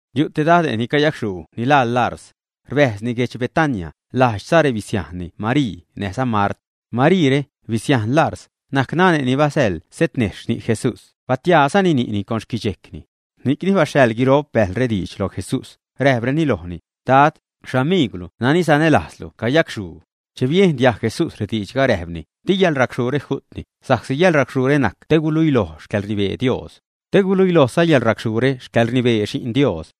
Yu' te dade' ni cayacxhuu ni laa Larz. Rbäjzni guedx Betania, lajdxza rebisiajnni Marii näjza Mart. Mariire, bisiajn Larz, najc nane' ni basäḻ setnejxh ni' Jesús, batiaazani ni'ni con xquidxejcni. Ni'cni baxhaḻ guiro'p bäjlre diidx loj Jesús, räjpreni lojni: ―Dad, xamiigwlu nani sanälajzlu cayacxhuu. Che biejn diajg Jesús rediidxga, räjpni: ―Di yäḻracxhuure ju'tni, sa'csi yäḻracxhuure najc te guluilojni xcäḻrnibee Dios. Te guluilojza yäḻracxhuure xcäḻrnibee Xi'n Dios.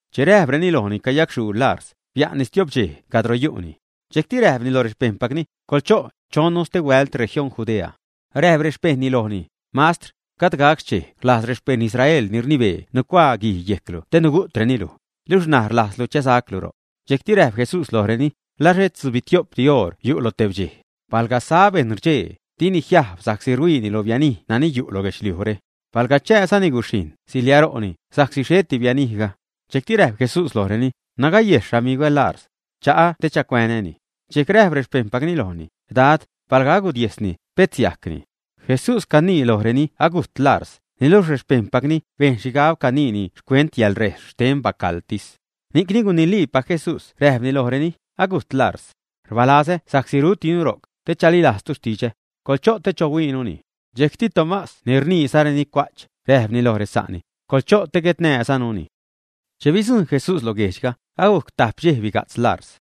che räjpreni lojni cayacxhuu Larz, bia'nni stio'p dxej cadro yu'ni. Dxejcti räjpni loj rexpejṉpacni: ―Coḻcho', chonnu stehuält región Judea. Räjp rexpejṉni lojni: ―Mastr, gajd gac xchej rlajz rexpejṉ Israel ni rnibee nucuaa guij yejclu te nugu'treni luj, luxh ṉaj rlajzlu chäsaclu ro'c. Dxejcti räjp Jesús lojreni: ―¿La xhet tzubitio'p oṟdi yu' lo tebdxej, ä? Palga sa bejṉ rdxee, dini jiajb sa'csi ruhuiini lo bianij nani yu' lo guedxliujre. Palga chasajni guxhijṉ, siliaro'ni, sa'csi xheti bianijga. Dxejcti räjp Jesús lojreni: ―Nagayejs xamigwä Larz. Cha'a te chacuänäni. Dxejc räjp rexpejṉpacni lojni: ―Dad, palga agudiesni, pet siajcni. Jesús canii lojreni agujt Larz, niluxh rexpejṉpacni bejn xhigab caniini xcuent yäḻrejs xten bacaḻtis. Ni'cni guniliipac Jesús räjpni lojreni: ―Agujt Larz. Rbalazä sa'csi rutinu ro'c, te chalilajztu xtidxä. Coḻcho' te chohuiinuni. Dxejcti Tomás ni rniizareni “cua'ch”, räjpni loj resa'ni: ―Coḻcho' te guetnäzanuni. Che bidzujṉ Jesús lo guejdxga, agujc tajp dxej biga'tz Larz.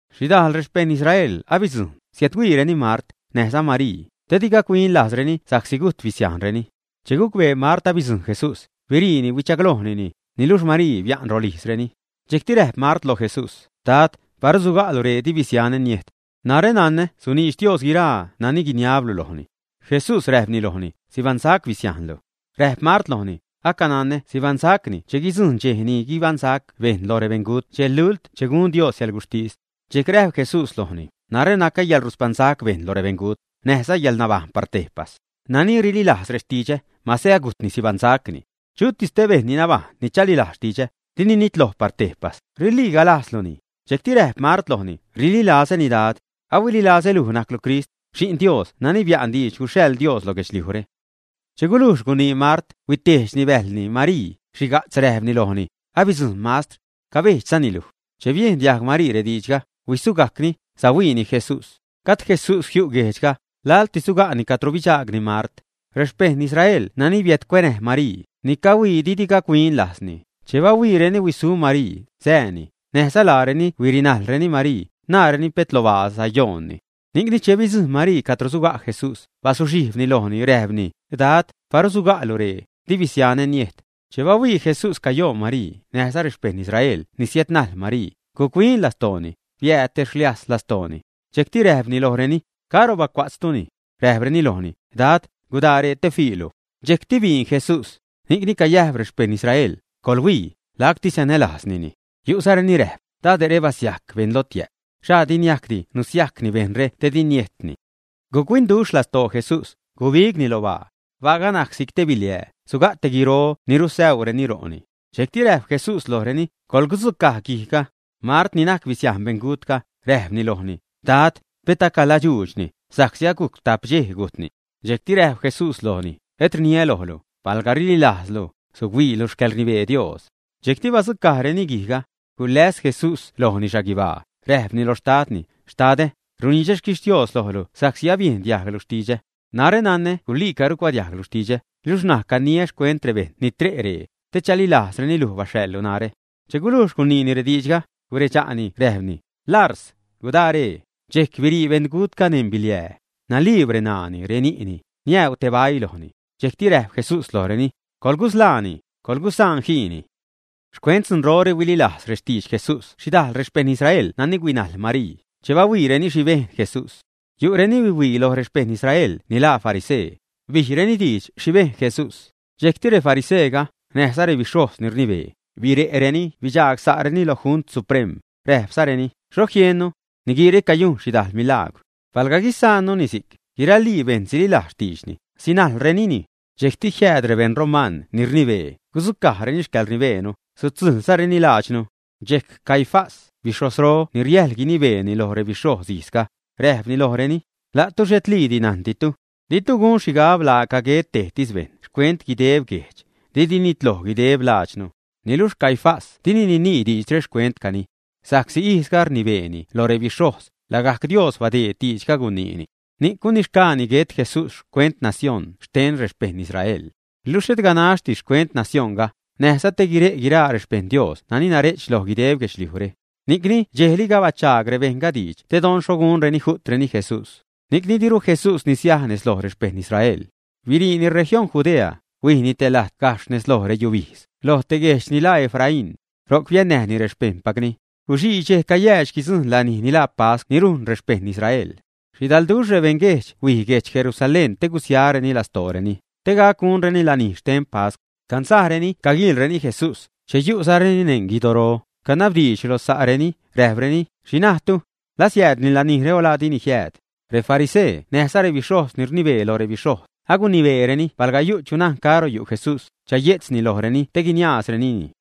Xhidajl rexpejṉ Israel abidzujṉ, siädhuiireni Mart, näjza Marii, te di gac-huin lajzreni sa'csi gujt bisiajnreni. Che gucbee Mart abidzujṉ Jesús, biriini huichaglojnini; niluxh Marii bia'n rolijzreni. Dxejcti räjp Mart lo Jesús: ―Dad, paru suga'lu ree, di bisianä niejt. Narä nanä suniidx Dios guiraa nani guiniablu lojni. Jesús räjpni lojni: ―Sibaṉsac bisiajnlu. Räjp Mart lojni: ―Acananä sibaṉsacni che guidzujṉ dxej ni guibaṉsac bejṉ loj rebeṉgut dxej lult che gun Dios yäḻguxhtis. Dxejc räjp Jesús lojni: ―Narä nacä yäḻruspaṉsac bejṉ loj rebeṉgut, näjza yäḻnabajṉ par tejpas. Nani rililajz rextidxä, masä agujtni, sibaṉsacni. Chutis tej bejṉ ni nabajṉ ni chalilajz xtidxä, dini nitloj par tejpas, ¿riliiga lajzluni, ä? Dxejcti räjp Mart lojni: ―Rililazäni, Dad. Ahuililazä luj najclu Crist, Xi'n Dios nani bia'n diidx guxhaḻ Dios lo guedxliujre. Che guluux gunii Mart, huitejdxni bäjlni Marii, xhiga'tz räjpni lojni: ―Abidzujṉ Mastr. Cabejdxzani luj. Che biejn diajg Marii rediidxga, huisugajcni, sahuiini Jesús. Gajd Jesús jiu' guejdxga, laḻtis suga'ni cadro bidxaagni Mart. Rexpejṉ Israel nani biädcuenäj Marii, ni cahuii didi gac-huin lajzni, che bahuiireni huisu Marii, sääni, näjza laareni huirinajlreni Marii, naareni pet lo baa sayoonni. Ni'cni che bidzujṉ Marii cadro suga' Jesús, bazuxhijbni lojni, räjpni: ―Dad, paru suga'lu ree, di bisianä niejt. Che bahuii Jesús cayoon Marii, näjza rexpejṉ Israel ni siädnajl Marii, guc-huin lastooni, biääd te rsliajz lastooni. Dxejcti räjpni lojreni: ―¿Caro bacua'tztuni? Räjpreni lojni: ―Dad, gudaa ree te fiilu. Dxejcti biin Jesús. Ni'cni cayäjp rexpejṉ Israel: ―Coḻhuii, lacti sanälajznini. Yu'zareni räjp: ―Dade're basiajc beṉ lotiä'p. ¿Xha di niajcdi nusiajcni bejṉre te di niejtni, ä? Guc-huinduxh lastoo Jesús, gubigni lo baa. Baaga najc si'c te biliää, suga' te guiro ni rusäuureni ro'ni. Dxejcti räjp Jesús lojreni: ―Coḻgudzucaj guijga. Mart, ni najc bisiajn beṉgutga, räjpni lojni: ―Dad, pet acaladxuudxni, sa'csi agujc tajp dxej gujtni. Dxejc räjp Jesús lojni: ―¿Et rniä lojlu, palga rililajztu, suhuiilu xcäḻrnibee Dios, ä? Dxejcti badzucajreni guijga. Guläs Jesús lojni xhaguibaa, räjpni loj Xtadni: ―Xtadä, runidxä xquixtios lojlu sa'csi abiejn diajglu xtidxä. Narä nanä guliica rucuadiajglu xtidxä, luxh ṉaj caniäni xcuent rebejṉ ni tre' ree, te chalilajzreni luj baxhaḻlu narä. Che gulujx guniini rediidxga, guredxa'ni räjpni: ―¡Larz! ¡Gudaa ree! Dxejc birii beṉgutga neṉ biliää. Naliib reṉaani, reni'ni, niäuu te baii lojni. Dxejcti räjp Jesús lojreni: ―Coḻgusḻaani, coḻgusaan jiini. Xcuent dzunrore huililajz rextidx Jesús xhidajl rexpejṉ Israel nani huinajl Marii, che bahuiireni xhi bejn Jesús. Yu' reni huihuii loj rexpejṉ Israel ni laa farisee, bijreni diidx xhi bejn Jesús. Dxejcti refariseega, näjza rebixhojz ni rnibee, bire'reni bidxagsa'reni lo Junt Suprem, räjpzareni: ―¿Xho jiennu? Niguiire cayujn xhidajl milagwr. Palga guisaannuni si'c, guiralii bejṉ sililajz xtiidxni, sinajlrenini. Dxejcti jiääd rebeṉ roman ni rnibee, gudzucajreni xcäḻrnibeenu, sudzujlzareni lajdxnu. Dxejc Caifás, bixhojzro ni riäjl gunibeeni lo rebixhojz ijzga, räjpni lojreni: ―La'tu xhetliidi najnditu. Ditu gun xhigab laaca guet tejtis bejṉ xcuent guideb guejdx, didi nitloj guideb lajdxnu. Niluxh Caifás dini ninii diidxre xcuentcani. Sa'csi ijzga rnibeeni lo rebixhojz, lagajc Dios badeed diidxga guniini. Ni'c gunixgaani guet Jesús xcuent nacióṉ xten rexpejṉ Israel. Luxh xhet ganaxtis xcuent nacioṉga, näjza te guire' guiraa rexpejṉ Dios nani nare'ch loj guideb guedxliujre. Ni'cni dxejliga bachaag rebejṉga diidx te don xho gunreni gugu'treni Jesús. Ni'cni diru Jesús nisiaj nez loj rexpejṉ Israel. Biriini región Judea, huijni te lajt gajxh nez lo reyubijdz, lo te guejdx ni laa Efraín. Ro'c biannäjni rexpejṉpacni. Guxii dxej cayäädx guidzujṉ lanij ni laa pascw ni rujn rexpejṉ Israel. Xhidalduxh rebeṉguejdx huij guedx Jerusalén te gusiareni lastooreni, te gac gunreni lanij xten pascw. Cansajreni caguiilreni Jesús; che yu'zareni neṉ guidoro, canabdiidx lo sa'reni, räjpreni: ―¿Xhi najtu? ¿La siäädni lanijre o laa dini jiääd, ä? Refarisee näjza rebixhojz ni rnibee loj rebixhojz, agunibeereni palga yu' chu najn caro yu' Jesús, chaye'tzni lojreni te guiniaazrenini.